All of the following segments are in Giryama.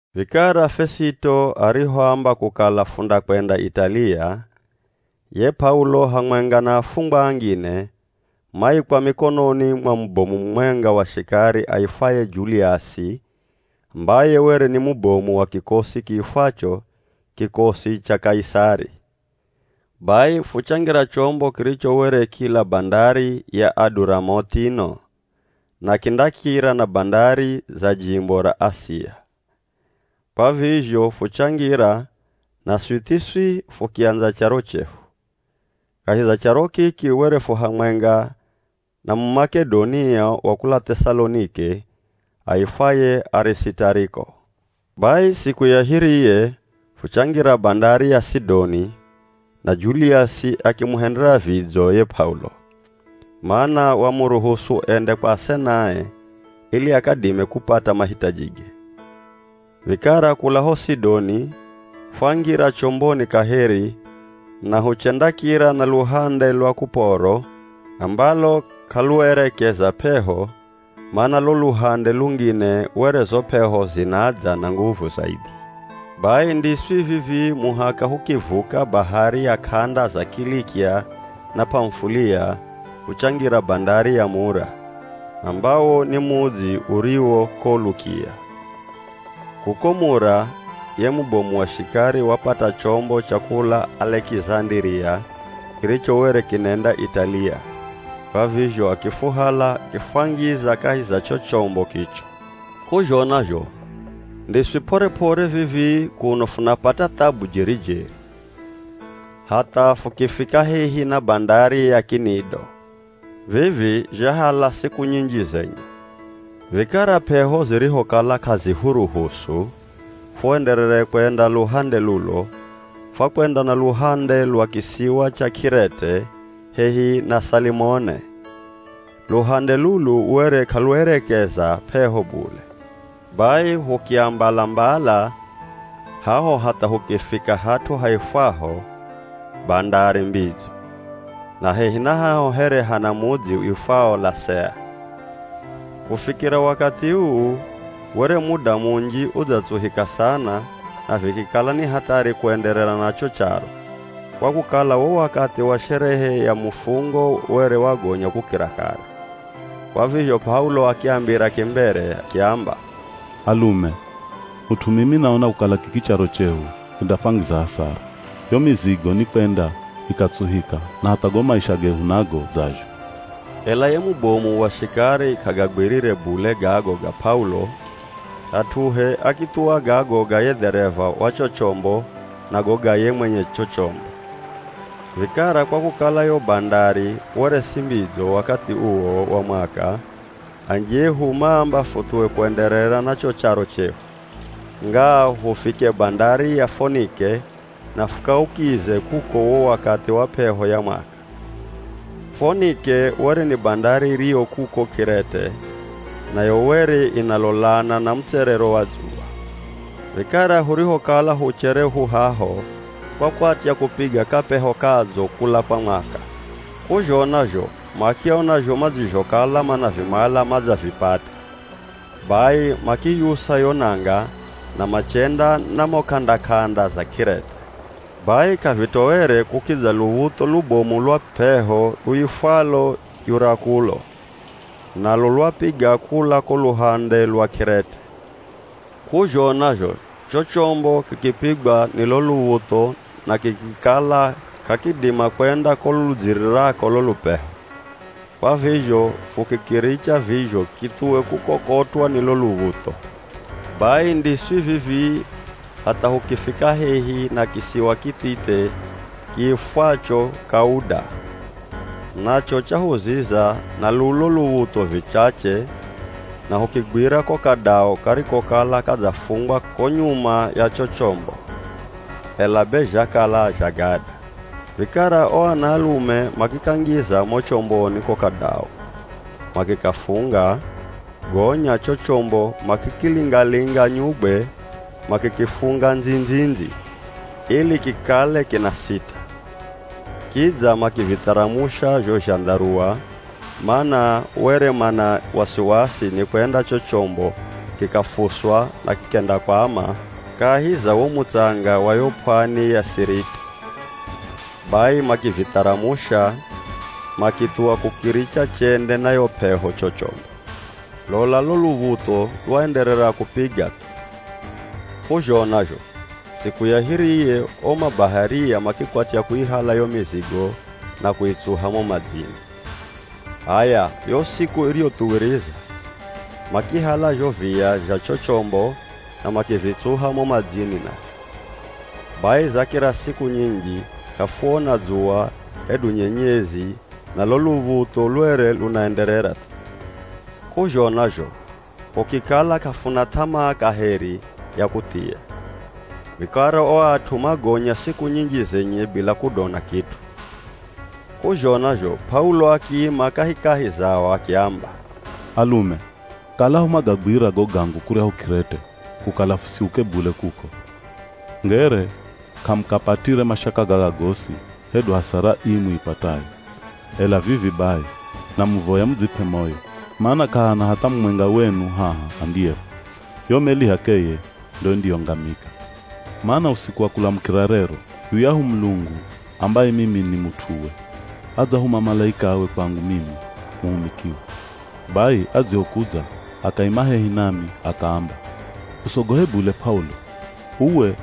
Vikara Fesito arihoamba kukala fundakwenda Italiya, ye P'aulo hamwenga na afungwa angine, maikwa mikononi mwa mubomu mumwenga wa shikari aifwaye Juliasi ambaye were ni mubomu wa kikosi kiifwacho “Kikosi cha Kaisari.” Bai fuchangira chombo kiricho were kila bandari ya Aduramutino na kindakira na bandari za jimbo ra Asia. Kwa vizho fuchangira, naswi thiswi, fukiandza charo chehu. Kahi za charo kiki were fu hamwenga na Mumak'edonia wa kula Th'esalonike aifwaye Arisitariko. Bai siku ya hiriye fuchangira bandari ya Sidoni, na Juliasi akimuhendera vidzo ye P'aulo, mana wamuruhusu ende kwa asenae ili akadime kupata mahitajige. Vikara kula ho Sidoni, fwangira chomboni kaheri na huchendakira na luhande lwa Kuporo ambalo k'aluerekeza p'eho mana lo luhande lungine were zo p'eho zinadza na nguvu zaidhi. Bai ndiswi vivii muhaka hukivuka bahari ya k'anda za Kilikia na P'amufulia fuchangira bandari ya Mura, ambawo ni mudzi uriwo ko Lukia. Kuko Mura, ye mubomu wa shikari wapata chombo cha kula Alekizandiria kiricho were kinenda Italiya, kwa vizho akifuhala akifwangiza kahi za cho chombo kicho. K'uzhona zho ndiswi p'ore-p'ore vivi kuno funapata thabu jeri-jeri, hatha fukifika hehi na bandari ya Kinido. Vivi zhahala siku nyinji zenye. Vikara p'eho zirihokala k'azihurusu fuenderere kwenda luhande lulo, fwakwenda na luhande lwa kisiwa cha K'irete, hehi na Salimone. Luhande lulu were k'aluerekeza p'eho bule. Bai hukiambala-mbala haho hatha hukifika hat'u haifwaho “Bandari Mbidzo” na hehi na haho here hana mudzi uifwao Lasea. Kufikira wakathi uu, were muda munji udzatsuhika sana na vikikala ni hathari kuenderera na cho charo, kwa kukala wo wakathi wa sherehe ya Mufungo were wagonya kukira kare. Kwa vizho P'aulo akiambira kimbere akiamba, “Alume, mut'u mimi naona kukala kiki charo chehu kindafwangiza hasara, yo mizigo nikwenda ikatsuhika na hatha go maisha gehu nago dzazho.” Ela ye mubomu wa shikari k'agagwirire bule gago ga P'aulo hat'uhe akithuwa gago ga ye dhereva wa cho chombo na go ga ye mwenye cho chombo. Vikara kwa kukala yo bandari were si mbidzo wakathi uwo wa mwaka, anji ehu maamba futhuwe kuenderera na cho charo chehu, ngaa hufike bandari ya Fonike na fukaukize kuko wo wakathi wa p'eho ya mwaka. Fonike were ni bandari iriyo kuko K'irete, nayo were inalolana na mutserero wa dzuwa. Vikara hurihokala huchere hu haho kwakwatya kupiga kapeho kadzo kula kwa mwaka, k'uzhona zho makiona zho madzizhokala manavimala madzavipata bai makiyusa yo nanga na machenda na mo k'anda-k'anda za K'irete. Bai k'avitoere kukidza luv̱utho lubomu lwa p'eho luifwalo Yurakulo, nalo lwapiga kula ko luhande lwa K'irete. K'uzhona zho cho chombo kikipigwa ni lo luv̱utho na kikikala k'akidima kwenda ko ludzirirako lo lupeho, kwa vizho fukikiricha vizho kithuwe kukokotwa ni lo luv̱utho. Bai ndiswi vivii, hatha hukifika hehi na kisiwa kithithe kiifwacho Kauda, nacho chahuziza na lulo luv̱utho vichache na hukigwira ko kadau karikokala gadzafungwa ko nyuma ya cho chombo, ela be zhakala zha gada. Vikara o anaalume makikangiza mo chomboni ko kadau, makikafunga, gonya cho chombo makikilinga-linga nyugwe makikifunga ndzi-ndzi-ndzi, ili kikale kinasita. Kidza makivitharamusha zho zhandharua, mana were mana wasiwasi nikwenda cho chombo kikafuswa na kikendakwama kahi za wo mutsanga wa yo p'wani ya Siriti. Bai makivitharamusha, makithuwa kukiricha chende na yo p'eho cho chombo. Lola lo luv̱utho lwaenderera kupiga thu. K'uzhona zho siku ya hiriye o mabaharia makikwatya kuihala yo mizigo na kuitsuha mo madzini. H'aya, yo siku iriyothuwiriza makihala zho viya zha cho chombo na makivitsuha mo madzini nazho. Bai zakira siku nyinji k'afuona dzuwa hedu nyenyezi na lo luv̱utho lwere lunaenderera thu, k'uzhona zho hukikala k'afuna th'amaa kaheri ya kuthia. Vikara o at'u magonya siku nyinji zenye bila kudona kit'u. K'uzhona zho P'aulo akiima kahikahi zao akiamba, “Alume, kalaho mwagagwira go gangu kuryahu K'irete, kukala fusiuke bule kuko, ngere k'amukapatire mashaka gaga gosi hedu hasara ii muipatayo. Ela vivi bai, namuvoya mudzip'e moyo, mana k'ahana hatha mumwenga wenu haha andiyefwa, yo meli h'akeye ndo indiyongamika. Mana usiku wa kulamukira rero, yuyahu Mulungu ambaye mimi ni mut'uwe, adzahuma malaikawe kwangu mimi muhumikiwe. Bai adzihokudza akaima hehi nami akaamba, ‘Usogohe bule P'aulo, uwe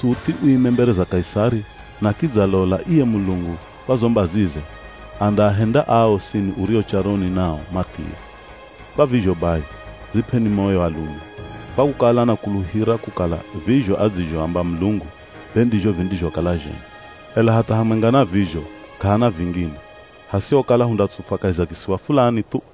suthi uime mbere za Kaisari na kidza lola iye Mulungu kwa zo mbazize, andaahenda aa osini urio charoni nao mathie.’ Kwa vizho bai, dzip'eni moyo alume, kwa kukala nakuluhira kukala vizho adzizhoamba Mulungu be ndizho vindizhokala zhenye. Ela hatha hamwenga na vizho k'ahana vingine, hasihokala hundatsufwa kahi za kisiwa fulani thu.”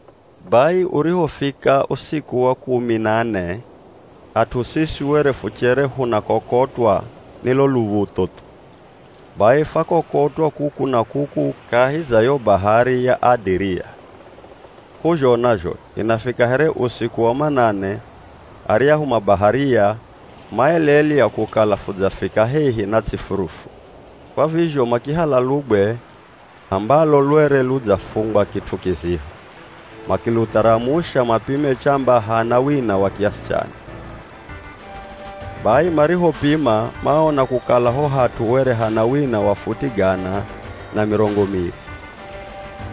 Bai urihofika usiku wa kumi na ne, at'u siswi were fuchere hunakokotwa ni lo luv̱utho thu. Bai fwakokotwa kuku na kuku kahi za yo bahari ya Adiria. K'uzhona zho inafika here usiku wa manane, aryahu mabaharia maelelya kukala fudzafika hehi na ts'i furufu, Kwa vizho makihala lugwe ambalo lwere ludzafungwa kit'u kiziho, makilutharamusha mapime chamba hana wina wa kiasi chani. Bai marihopima maona kukala ho hat'u were hana wina wa futi gana na mirongo miri.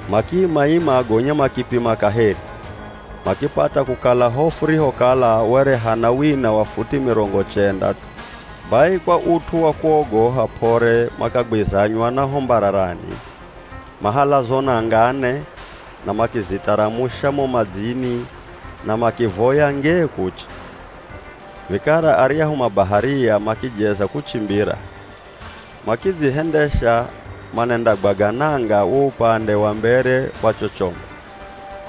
Makiima-ima, gonya makipima kaheri, makipata kukala ho furihokala were hana wina wa futi mirongo chenda thu. Bai kwa ut'u wa kuogoha p'ore makagwizanywa na ho mbararani, mahala zo nanga ne na makizitharamusha mo madzini na makivoya ngee kuche. Vikara aryahu mabaharia makijeza kuchimbira, makidzihendesha manendagwaga nanga wo upande wa mbere wa cho chombo.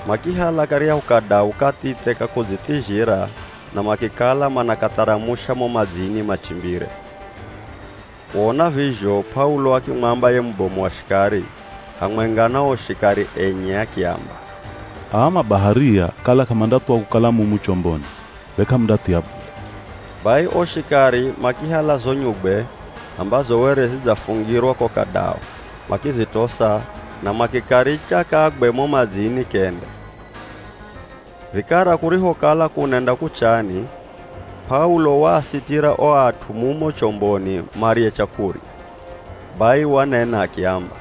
Makihala karyahu kadau kathithe ka kudzithizhira na makikala manakatharamusha mo madzini machimbire. Kuona vizho P'aulo akimwamba ye mubomu wa shikari, hamwenga na o shikari enye akiamba, “Aa mabaharia kala k'amandathuwa kukala mumu chomboni, be k'amundathia bule.” Bai o shikari makihala zo nyugwe ambazo were zidzafungirwa ko kadau makizitosa na makikaricha kagwe mo madzini kende. Vikara kurihokala kunenda kuchani, P'aulo waasitira o at'u mumo chomboni marye chakurya. Bai wanena akiamba,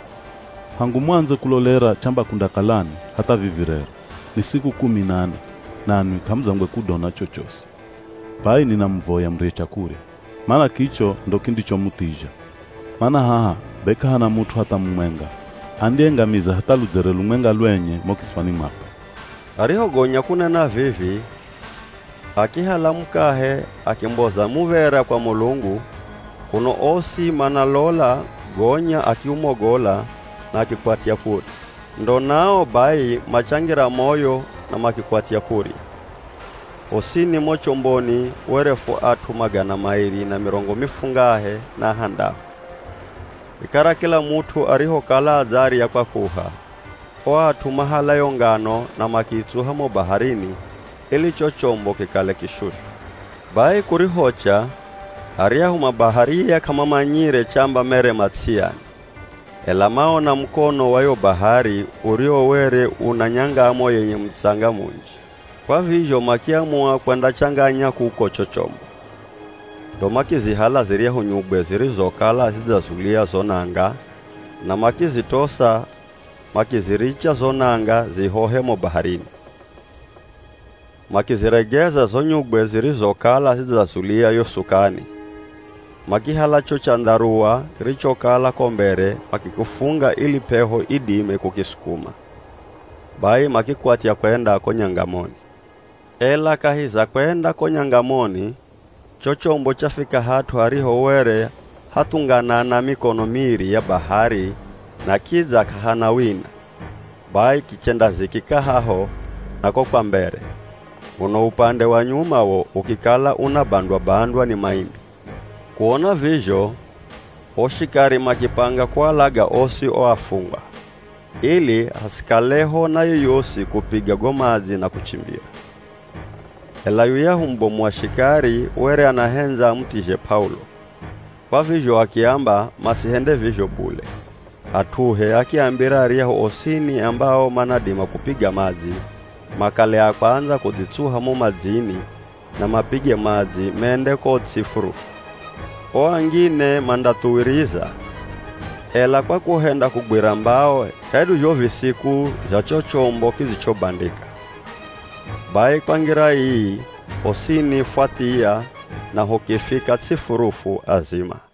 “Hangu muandze kulolera chamba kundakalani, hatha vivi rero, ni siku kumi na ne nanwi k'amudzangwe kudona chochosi. Bai ninamuvoya murye chakurya, mana kicho ndo kindichomuthizha. Mana haha be k'ahana mut'u hatha mumwenga andiyengamiza hatha ludzere lumwenga lwenye mo kitswani mwakwe.” Arihogonya kunena vivi, akihala mukahe akimboza muv̱era kwa Mulungu, kuno osi mana lola, gonya akiumogola na akikwatya kurya. Ndo nao bai, machangira moyo na makikwatya kurya. Hosini mo chomboni were fu at'u magana mairi na mirongo mifungahe na ahandahu. Vikara kila mut'u arihokala adzarya kwakuha, o at'u mahala yo ngano na makiitsuha mo baharini ili cho chombo kikale kishushu. Bai kurihocha aryahu mabaharia k'amamanyire chamba mere ma ts'i yani, ela maona mukono wa yo bahari uriwo were una nyangamo yenye mutsanga munji. Kwa vizho makiamua kwendachanganya kuko cho chombo. Ndo makizihala ziryahu nyugwe zirizokala zidzazulia zo nanga na makizitosa makiziricha zo nanga zihohe mo baharini. Makiziregeza zo nyugwe zirizokala zidzazulia yo sukani, makihala cho chandharuwa kirichokala ko mbere makikifunga ili p'eho idime kukisukuma, bai makikwatya kwenda ko nyangamoni. Ela kahi za kwenda ko nyangamoni cho chombo chafika hat'u hariho were hathunganana mikono miri ya bahari na kidza k'ahana wina, bai kichendazikika haho na ko kwa mbere, uno upande wa nyuma wo ukikala unabandwa-bandwa ni maimbi. Kuona vizho o shikari makipanga kualaga osi o afungwa, ili hasikaleho na yoyosi kupiga go madzi na kuchimbira. Ela yuyahu mubomu wa shikari were anahendza amuthizhe P'aulo, kwa vizho akiamba masihende vizho bule, hat'uhe akiambira aryahu osini ambao manadima kupiga madzi, makale a kwandza kudzitsuha mo madzini na mapige madzi mende ko ts'i furufu. O angine mandathuwiriza, ela kwa kuhenda kugwira mbao hedu zho visiku zha cho chombo kidzichobandika. Bai kwa ngira ii hosini fwathiya na hukifika ts'i furufu azima.